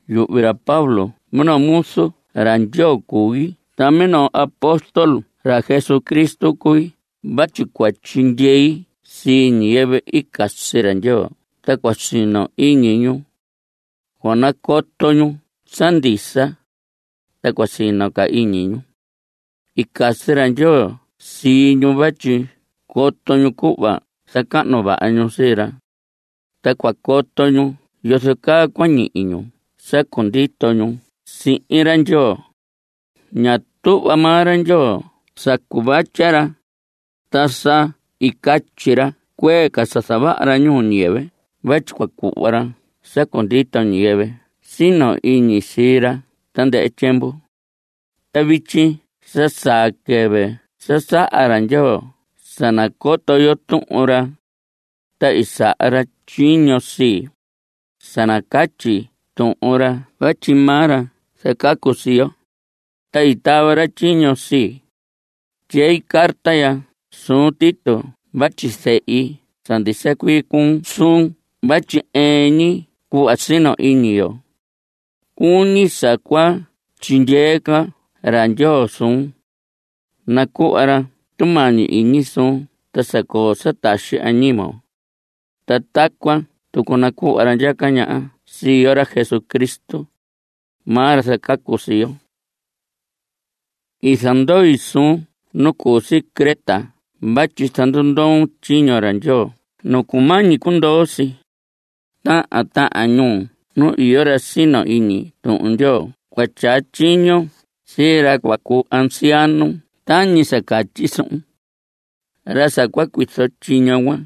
Yuhvi ra Pablo minoo muzu ra Ndyoo cui ta minoo apóstol ra Jesucristo cui vatyi cua tyindyei sii ñiyɨvɨ i casi ra Ndyoo ta cua sino iñi ñu. Cua nacoto ñu sa ndisa, ta cua sino ca iñi ñu. I casi ra Ndyoo sii ñu vatyi coto ñu cuhva zacahnu vaha ñu sii ra. Ta cua coto ñu yozo caa cua ñihi ñu sa cundito ñu sihin ra Ndyoo. Ña tuhva maa ra Ndyoo sa cuvatya ra, ta sa i catyi ra cuee ca sa zavaha ra ñuu ñiyɨvɨ vatyi cua cuhva ra sa cundito ñiyɨvɨ sino iñi sii ra tandɨhɨ tyiemvu. Ta vityi sa saa quɨvɨ sa saha ra Ndyoo sa nacoto yo Tuhun ra. Ta i saha ra tyiño sii, sa nacatyi Tuhun ra vatyi maa ra zacacu sii yo, ta i tava ra tyiño sii. Tyei carta ya suun Tito vatyi zehi sa ndisa cuii cuu suun vatyi ɨɨn ñi cuhva sino iñi yo. Cuñi sa cua tyindyee ca ra Ndyoo suun. Nacuhva ra tumañi iñi suun ta sa coo sa taxi añimon. Ta tacuan tucu nacuhva ra ndyaca ñaha sii yo, ra Jesucristo. Maa ra zacacu sii yo. I zandoi suun nu cu si Creta vatyi zandundoon tyiño ra Ndyoo nu cumañi cundoo si. Tahan tahan ñuu nu iyo ra sino iñi Tuhun Ndyoo cua tyaa tyiñon sii ra cua cuu anciano tañi sa catyi suhun. Ra sa cua cuizo tyiño cuan,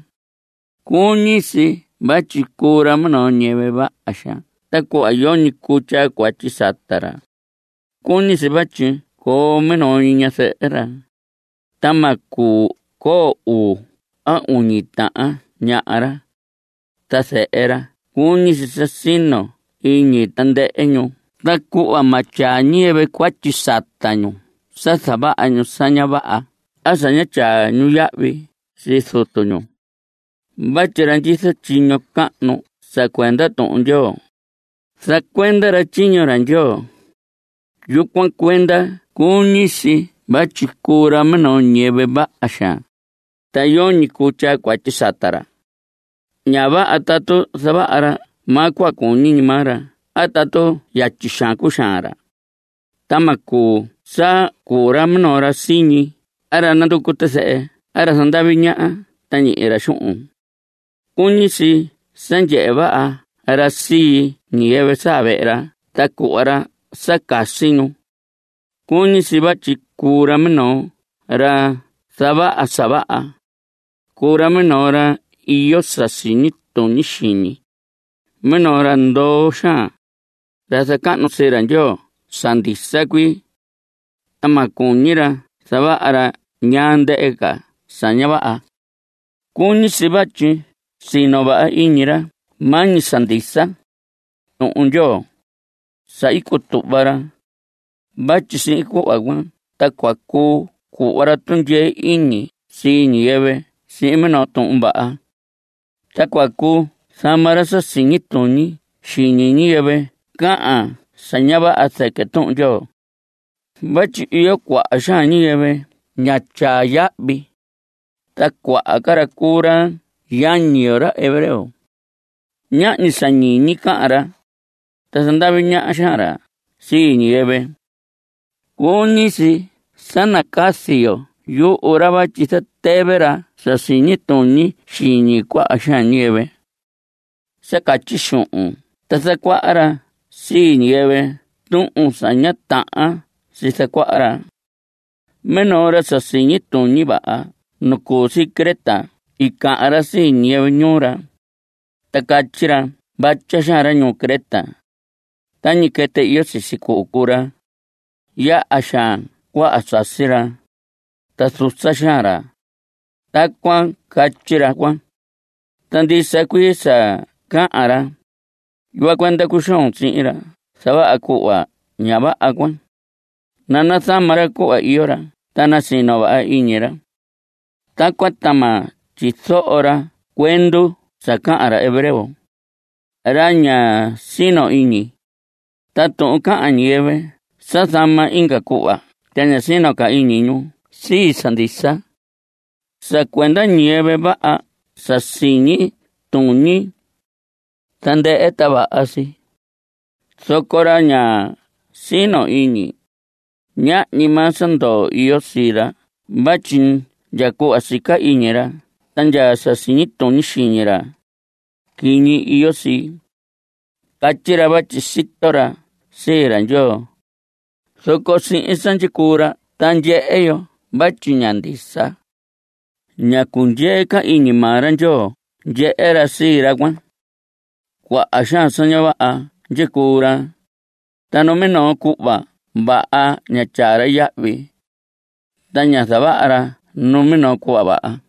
cuñi si vatyi cuu ra minoo ñiyɨvɨ vaha xaan tacuhva yoñi cuu tyaa cuatyi sata ra. Cuñi si vatyi coo minoo ñi ñazɨhɨ ra, ta ma cuu coo uu a uñi tahan ñaha ra. Ta zehe ra cuñi si sa sino iñi tandɨhɨ ñu tacuhva ma tyaa ñiyɨvɨ cuatyi sata ñu sa zavaha ñu sa ña vaha a sa ña tyaa ñu yahvi sii zutu ñu. Vatyi ra ndyizo tyiño cahnu sa cuenda Tuhun Ndyoo, zacuenda ra tyiño ra Ndyoo. Yucuan cuenda cuñi si vatyi cuu ra minoo ñiyɨvɨ vaha xaan, ta yoñi cuu tyaa cuatyi sata ra. Ña vaha tatu zavaha ra maa ñi cuhva cuñi maa ra a tatu yatyi xaan cuxaan ra. Ta ma cuu sa cuu ra minoo ra siñi a ra nanducu tizɨhɨ a ra zandavi ñaha ta ñihi ra xuhun. Cuñi si sa ndyehe vaha ra sii ñiyɨvɨ saa vehe ra ta cuhva ra sa casi ñu. Cuñi si vatyi cuu ra minoo ra zavaha sa vaha, cuu ra minoo ra iyo sa siñi tuñi xiñi, minoo ra ndoo xaan, ra zacahnu sii ra Ndyoo sa ndisa cuii. Ta ma cuñi ra zavaha ra ñaa ndɨhɨ sa ña vaha. Cuñi si vatyi sino vaha iñi ra maa ñi sa ndisa, Tuhun Ndyoo, sa i cutuhva ra, vatyi sihin cuhva cuan ta cua cuu cuhva ra tundyee iñi sii ñiyɨvɨ sihin minoo tuhun vaha. Ta cua cuu zama ra sa siñi tuñi xiñi ñiyɨvɨ cahan sa ña vaha zɨquɨ Tuhun Ndyoo. Vatyi iyo cuaha xaan ñiyɨvɨ ña tyaa yahvi, ta cuaha ca ra cuu ra yañi yo, ra hebreo. Ñahñi sa ñiñi cahan ra, ta zandavi ñaha xaan ra sii ñiyɨvɨ. Cuñi si sa nacazi yo yuhu ra vatyi zatɨvɨ ra sa siñi tuñi xiñi cuaha xaan ñiyɨvɨ. Sa catyi xuhun ta zacuaha ra sii ñiyɨvɨ tuhun sa ña tahan si zacuaha ra. Minoo ra sa siñi tuñi vaha nu cu si Creta i cahan ra sii ñiyɨvɨ ñuu ra, ta catyi ra: “Vatya xaan ra ñuu Creta. Tañi quɨtɨ iyo sisi cuhu cuu ra. Yaha xaan cuaha sasi ra, ta susa xaan ra.” Tacuan catyi ra cuan. Ta ndisa cuii sa cahan ra. Yucuan cuenda cuxoon sihin ra zavaha cuhva ña vaha cuan, nanazama ra cuhva iyo ra ta nasino vaha iñi ra. Tacuan ta ma tyizoho ra cuendu sa cahan ra hebreo, ra ña sino iñi, ta tuhun cahan ñiyɨvɨ sa zama inga cuhva ta ña sino ca iñi ñu sii sa ndisa. Sa cuenda ñiyɨvɨ vaha sa siñi tuñi, tandɨhɨ ta vaha si. Zoco ra ña sino iñi, ñahñi maa sa ndoo iyo sii ra vatyi ndya cuhva sica iñi ra ta ndya sa siñi tuñi xiñi ra, quiñi iyo si. Catyi ra vatyi sito ra sii ra Ndyoo, zoco sihin sa ndyicuu ra ta ndyehe yo vatyi ña ndisa. Ña cundyee ca iñi maa ra Ndyoo ndyehe ra sii ra cuan. Cuaha xaan sa ña vaha ndyicuu ra, ta numinoo cuhva vaha ña tyaa ra yahvi. Ta ña zavaha ra numinoo cuhva vaha.